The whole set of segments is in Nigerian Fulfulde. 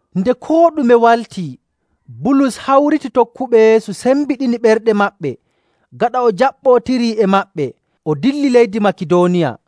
Nde koo ɗume waltii, Bulus hawriti tokkuɓe Yeesu, sembiɗini ɓerɗe maɓɓe. Gaɗa o jaɓɓootiri e maɓɓe, o dilli leydi Makidooniya.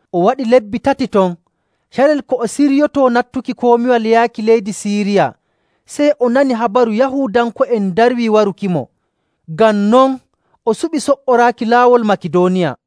O waɗi lebbi tati ton. Carel ko o siryotoo nattuki komiwal yaaki leydi Siiriya, sey o nani habaru Yahuudanko'en ndarwii warukimo. Ngam non, o suɓi so''oraaki laawol Makidooniya.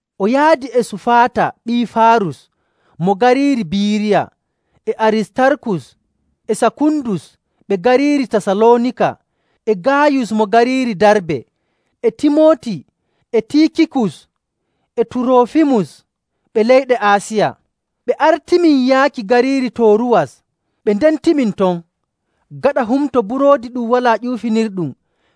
O yaadi e Sufaata ɓii Faarus mo gariiri Biiriya, e Aristarkus e Sakundus ɓe gariiri Tasaloonika, e Gaayus mo gariiri Darbe, e Timooti e Tiikikus e Turoofimus ɓe leyɗe Aasiya. Ɓe artimin yaaki gariiri Tooruwas, ɓe ndentimin ton. Gaɗa Humto Buroodi Ɗum Walaa Ƴuufinirɗum,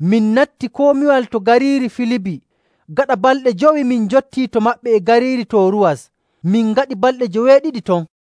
min natti komiwal to gariiri Filibi. Gaɗa balɗe jowi min njottii to maɓɓe e gariiri Tooruwas, min ngaɗi balɗe joweeɗiɗi ton.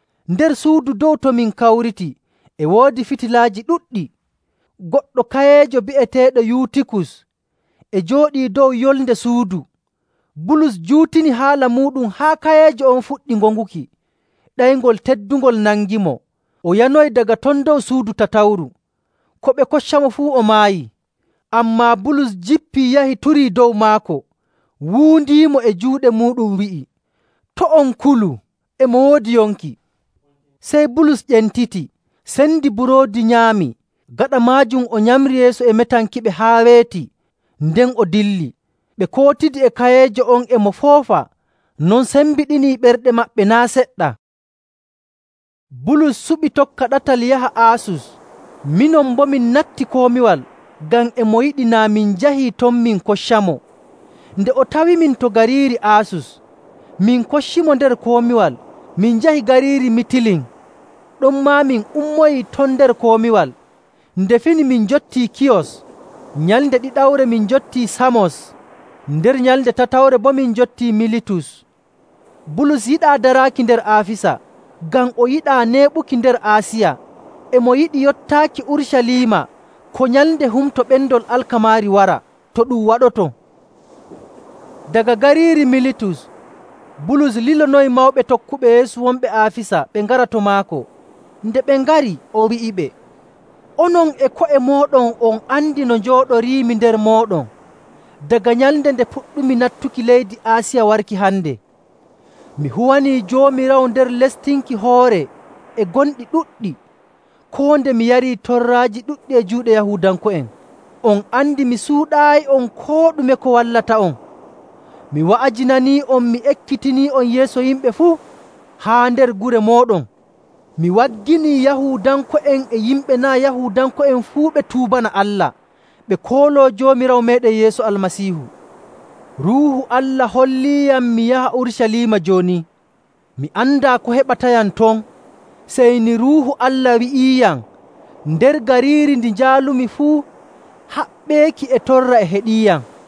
Nder suudu dow to min kawriti e woodi fitilaaji ɗuɗɗi. Goɗɗo kayeejo bi'eteeɗo Yuutikus e jooɗii dow yolnde suudu. Bulus juutini haala muuɗum haa kayeejo on fuɗɗi ŋoŋuki. Ɗeyngol teddungol nangimo, o yanoyi daga ton dow suudu tatawru. Ko ɓe koccamo fuu, o maayii. Ammaa Bulus jippii, yahi, turii dow maako, wuundiimo e juuɗe muuɗum, wi'i, “To' on kulu! E mo woodi yonki!” Sey Bulus ƴentiti, sendi buroodi, nyaami. Gaɗa maajum o nyamri yeeso e metankiɓe haa weeti, nden o dilli. Ɓe kootidi e kayeejo on, e mo foofa. Non sembiɗinii ɓerɗe maɓɓe naa' seɗɗa. Bulus suɓi tokka ɗatal yaha Aasus. Minon boo, min natti komiwal ngam e mo yiɗi naa min njahii ton min koccamo. Nde o tawimin to gariiri Aasus, min koccimo nder komiwal, min njahi gariiri Mitilin. Ɗonmaa min ummoyii ton nder komiwal, nde fini min njottii Kiyos. Nyalnde ɗiɗawre min njottii Saamos, nder nyalnde tatawre boo min njottii Militus. Bulus yiɗaa daraaki nder Aafisa, ngam o yiɗaa neeɓuki nder Aasiya. E mo yiɗi yottaaki Urucaliima ko nyalnde Humto Ɓendol Alkamaari wara, to ɗum waɗoto. Daga gariiri Militus, Bulus lilonoyi mawɓe tokkuɓe Yeesu wonɓe Aafisa ɓe ngara to maako. Nde ɓe ngari, o wi'iɓe, “Onon e ko'e mooɗon on andi no njooɗoriimi nder mooɗon daga nyalnde nde puɗɗumi nattuki leydi Aasiya warki hande. Mi huwanii Joomiraawo nder lestinki hoore e gonɗi ɗuɗɗi, koo nde mi yarii torraaji ɗuɗɗi e juuɗe Yahuudanko'en. On andi mi suuɗaayi'on koo ɗume ko wallata'on. Mi wa'ajinanii'on, mi ekkitinii'on yeeso yimɓe fuu, haa nder gure mooɗon. Mi wagginii Yahuudanko'en e yimɓe naa' Yahuudanko'en fuu ɓe tuubana Allah, ɓe kooloo Joomiraawo meeɗen Yeesu Almasiihu. Ruuhu Allah holliiyam mi yaha Urucaliima jooni. Mi andaa ko heɓatayam ton, sey ni Ruuhu Allah wi'iiyam nder gariiri ndi njaalumi fuu haɓɓeeki e torra e heɗiiyam.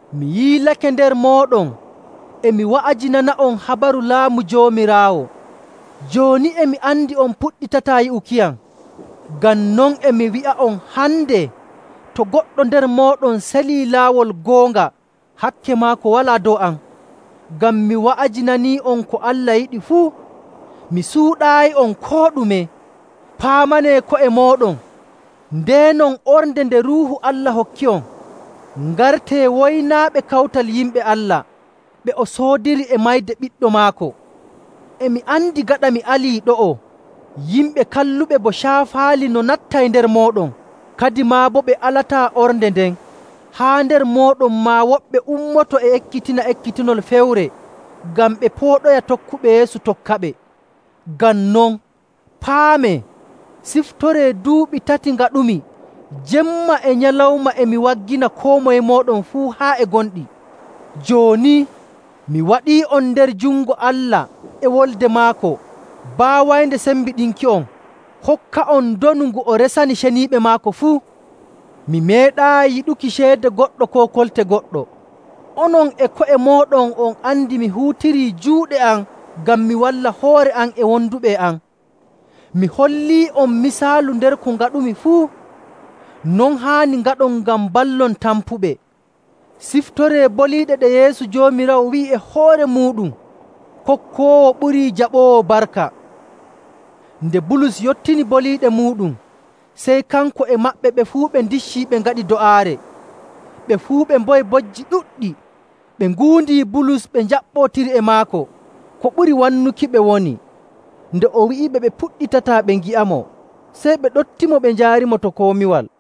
“Mi yiilake nder mooɗon, e mi wa'ajinana'on habaru Laamu Joomiraawo. Jooni, e mi andi on puɗɗitataa yi'ukiyam. Ngam non e mi wi'a'on hande to goɗɗo nder mooɗon selii laawol goonga, hakke maako walaa dow am. Ngam mi wa'ajinanii'on ko Allah yiɗi fuu, mi suuɗaayi'on koo ɗume. Paamanee ko'e mooɗon, ndeenon ornde nde Ruuhu Allah hokki'on. Ngartee woynaaɓe kawtal yimɓe Allah, ɓe o soodiri e mayde Ɓiɗɗo maako. E mi andi gaɗa mi alii ɗo'o yimɓe kalluɓe bo caafaali no nattay nder mooɗon, kadimaa boo ɓe alataa ornde nden. Haa nder mooɗon maa, woɓɓe ummoto e ekkitina ekkitinol fewre ngam ɓe pooɗoya tokkuɓe Yeesu tokkaɓe. Ngam non, paamee, ciftoree duuɓi tati ngaɗumi, jemma e nyalawma, e mi waggina koo moye mooɗon fuu haa e gonɗi. “Jooni, mi waɗii'on nder jungo Allah e wolde maako, baawaynde sembiɗinki'on hokka'on ndonu ngu o resani ceniiɓe maako fuu. Mi meeɗaayi yiɗuki ceede goɗɗo koo kolte goɗɗo. Onon e ko'e mooɗon, on andi mi huutirii juuɗe am ngam mi walla hoore am e wonduɓe e am. Mi hollii'on misaalu nder ko ngaɗumi fuu. Non haani ngaɗon ngam mballon tampuɓe. Ciftoree boliiɗe ɗe Yeesu Joomiraawo wi'i e hoore muuɗum, ‘Kokkoowo ɓurii jaɓoowo barka.’” Nde Bulus yottini boliiɗe muuɗum, sey kanko e maɓɓe ɓe fuu ɓe ndiccii ɓe ngaɗi do'aare. Ɓe fuu ɓe mboyi bojji ɗuɗɗi, ɓe nguundi Bulus ɓe njaɓɓotiri e maako. Ko ɓuri wannukiɓe woni nde o wi'iɓe ɓe puɗɗitataa ɓe ngi'amo. Sey ɓe ɗoftimo ɓe njaarimo to komiwal.